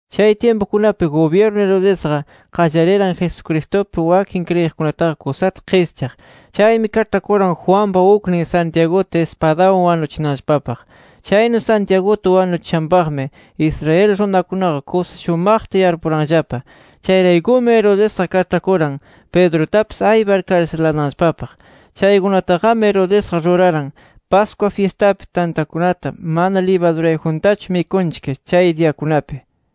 Chay tyimpukunapi gubyirnu Herodesqa, qallariran Jesucristupi wakin kriyiqkunataqa kusata qischaq. Chaymi kaĉhakuran Juanpa uknin Santiaguta ispadawan wanuchinanllapapaq. Chaynu Santiaguta wanuchishanpaqmi Israel runakunaqa kusa shumaqta yarpuranllapa. Chayraykumi Herodesqa kaĉhakuran Pedrutapis aypar karsilananllapapaq. Chaykunataqami Herodesqa ruraran Pascua fyistapi tantakunata mana libadurayjuntachu mikunchik chay diyakunapi.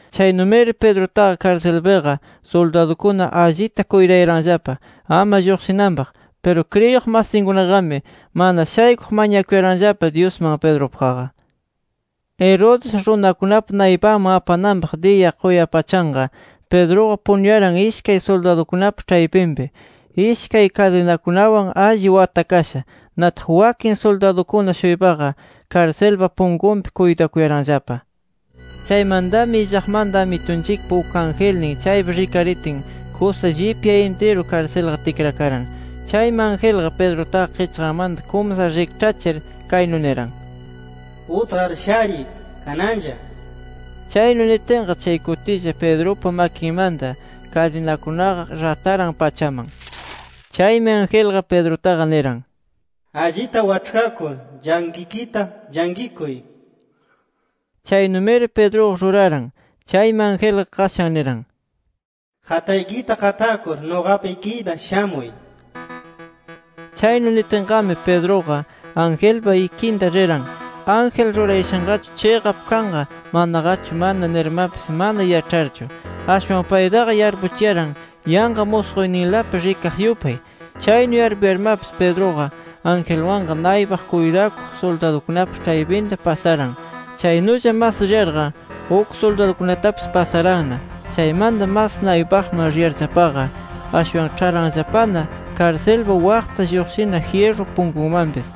Chaynumiri Pedrutaqa karsilpiqa suldadukuna allita kuytayaranllapa ama lluqshinanpaq. Piru kriyiq masinkunaqami mana shaykuq mañakuyaranllapa Dyusman, Pedrupaqqa. Herodes, runakunapa naypanman apananpaq diya quyapachanqa, Pedruqa punuyaran ishkay suldadukunapa ĉhaypinpi, ishkay kadinakunawan alli watakasha. Nataq wakin suldadukuna-shuypaqa karsilpa punkunpi kuytakuyaranllapa. Chaymantami illaqmanta Amitunchikpa uk angelnin chaypi rikaritin, kusa llipya intiru karsilqa tikrakaran. Chaymi angelqa Pedrutaqa qichqanmanta kumsar rikĉhachir kaynu niran: —Utqar shariy, kananlla nir. Chaynu nitinqa chay kutilla, Pedrupa makinmanta kadinakunaqa rataran pachaman. Chaymi angelqa Pedrutaqa niran: —Allita waĉhkakur, llanqikita llanqikuy nir. Chaynumiri Pedruqa ruraran. Chaymi angelqa qashan niran: —Qataykita qatakur, nuqapa ikiyta shamuy nir. Chaynu nitinqami Pedruqa angelpa ikinta riran, ángel rurayashanqachu chiqap kanqa, manaqachu mana nirmapis, mana yaĉharchu. Ashwan paytaqa yarpuchiyaran yanqa musquyninlapi rikaq yupay. Chaynu yarpuyarmapis Pedruqa angelwanqa naypaq kuytakuq suldadukunapa ĉhaypinta pasaran. Chaynulla mas riyarqa uk suldadukunatapis pasaranna. Chaymanta mas naypaqman riyarllapaqa ashwan ĉharanllapana karsilpa waqta lluqshina jyirru punkunmanpis.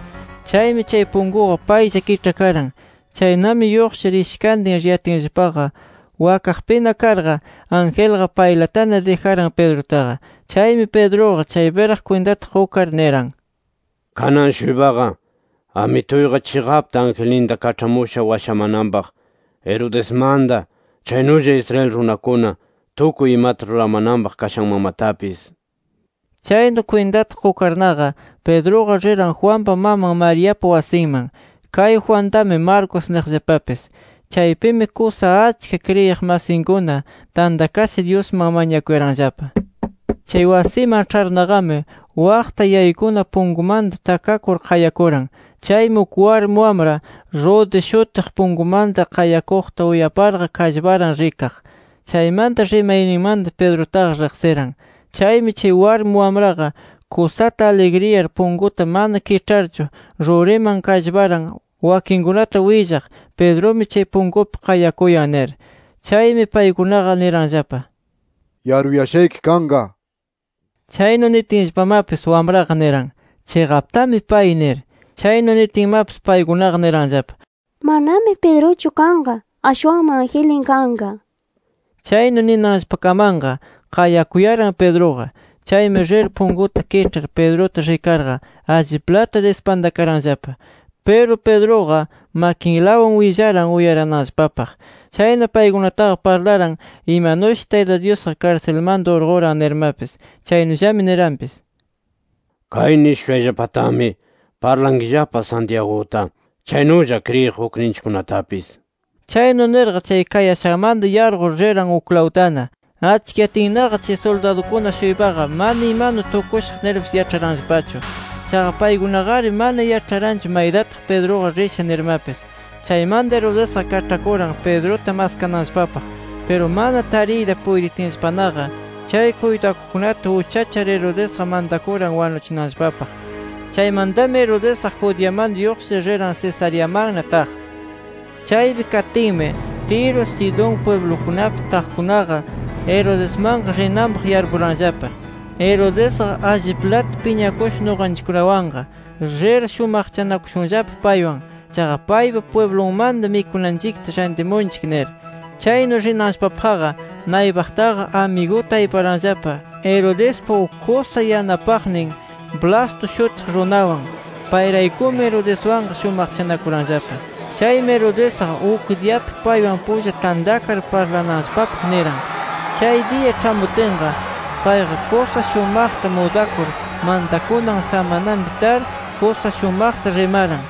Chaymi chay punkuqa paylla kiĉhakaran. Chaynami, lluqshir ishkantin riyatinllapaqa, wakaqpina karqa, angelqa paylatana dijaran Pedrutaqa. Chaymi Pedruqa chaypiraq kwintata qukar niran: “Kanan-shuypaqa Amituyqa chiqapta, angelninta kaĉhamusha washamananpaq Herodesmanta, chaynulla Israel runakuna tukuy imata ruramananpaq kashanmanmatapis” nir. Chaynu kwintata qukarnaqa, Pedruqa riran Juanpa maman Mariapa wasinman. Kay Juantami Marcos niqllapapis. Chaypimi kusa achka kriyiq masinkuna tantakasha, Dyusman mañakuyaranllapa. Chay wasiman ĉharnaqami, waqta yaykuna punkumanta takakur qayakuran. Chaymi, uk warmi wamra Rode shutiq, punkumanta qayakuqta uyaparqa kallparan rikaq. Chaymanta, rimayninmanta Pedrutaqa riqsiran. Chaymi chay warmi wamraqa kusata aligriyar, punkuta mana kiĉharchu ruriman kallparan wakinkunata willaq, Pedrumi chay punkupi qayakuyan nir. Chaymi paykunaqa niranllapa: —Yaruyashayki kanqa nir. Chaynu nitinllapamapis, wamraqa niran: —Chiqaptami pay nir. Chaynu nitinmapis, paykunaqa niranllapa: —Manami Pedruchu kanqa. Ashwanmi angelnin kanqa nir. Chaynu ninanllapakamanqa, qayakuyaran Pedruqa. Chaymi rir punkuta kiĉhar, Pedruta rikarqa alliplata dispantakaranllapa. Piru, Pedruqa makinlawan willaran uyarananllapapaq. Chayna paykunataqa parlaran imanushi, Tayta Dyusqa karsilmanta urquran nirmapis. Chaynullami niranpis: —Kay nishushayllapatami, parlankillapa Santiaguta, chaynulla kriyiq ukninchikkunatapis nir. Chaynu nirqa, chay kayashanmanta yarqur riran uklawtana. Achkiyatinnaqa, chay suldadukuna-shuypaqa mana imanu tukushaq nirpis yaĉharanllapachu. Chaqa paykunaqari mana yaĉharanchu maytataq Pedruqa risha nirmapis. Chaymanta, Herodesqa kaĉhakuran Pedruta maskananllapapaq. Piru mana tariyta puytitinllapanaqa, chay kuytakuqkunata uchachar, Herodesqa mantakuran wanuchinanllapapaq. Chaymantami Herodesqa Judeamanta lluqshir, riran Cesareamanna taq. Chaypi katinmi Tiro, Sidón pwiblukunapi taqkunaqa Herodesmanqa rinanpaq yarpuranllapa: Herodesqa, alliplata piñakusha nuqanchikkunawanqa. Rir shumaqchanakushunllapa paywan. Chaqa paypa pwiblunmanta mikunanchikta rantimunchik nir. Chaynu rinanllapapaqqa, naypaqtaqa amiguta ayparanllapa, Herodespa uk kusa yanapaqnin Blasto shutiq runawan. Payraykumi, Herodeswanqa shumaqchanakuranllapa. Chaymi, Herodesqa uk diyapi paywan pulla tantakar parlananllapapaq niran. Chay diya ĉhamutinqa, payqa kusa shumaqta mudakur mantakunan samananpi tar, kusa shumaqta rimaran.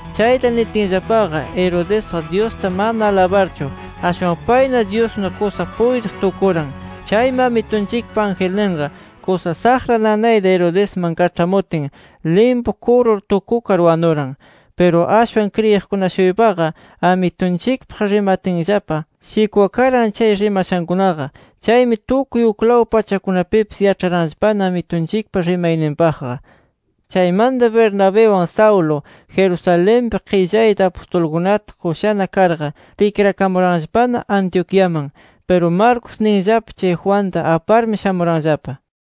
Chayta nitinllapaqa, Herodesqa Dyusta mana alabarchu, ashwan payna dyusnu kusa puytiq tukuran. Chaymi Amitunchikpa angelninqa kusa saqra nanayta Herodesman kaĉhamutin, limpu kurur tukukar wanuran. Piru ashwan kriyiqkuna-shuypaqa Amitunchikpaq rimatinllapa, shikwakaran chay rimashankunaqa. Chaymi, tukuy uklaw pachakunapipis yaĉharanllapana Amitunchikpa rimayninpaqqa. Chaymanta Bernabiwan Saulo Jerusalenpi qillayta apustulkunata qushana karqa tikrakamuranllapana Antioquiaman. Piru Marcos ninllapa chay Juanta aparmi shamuranllapa.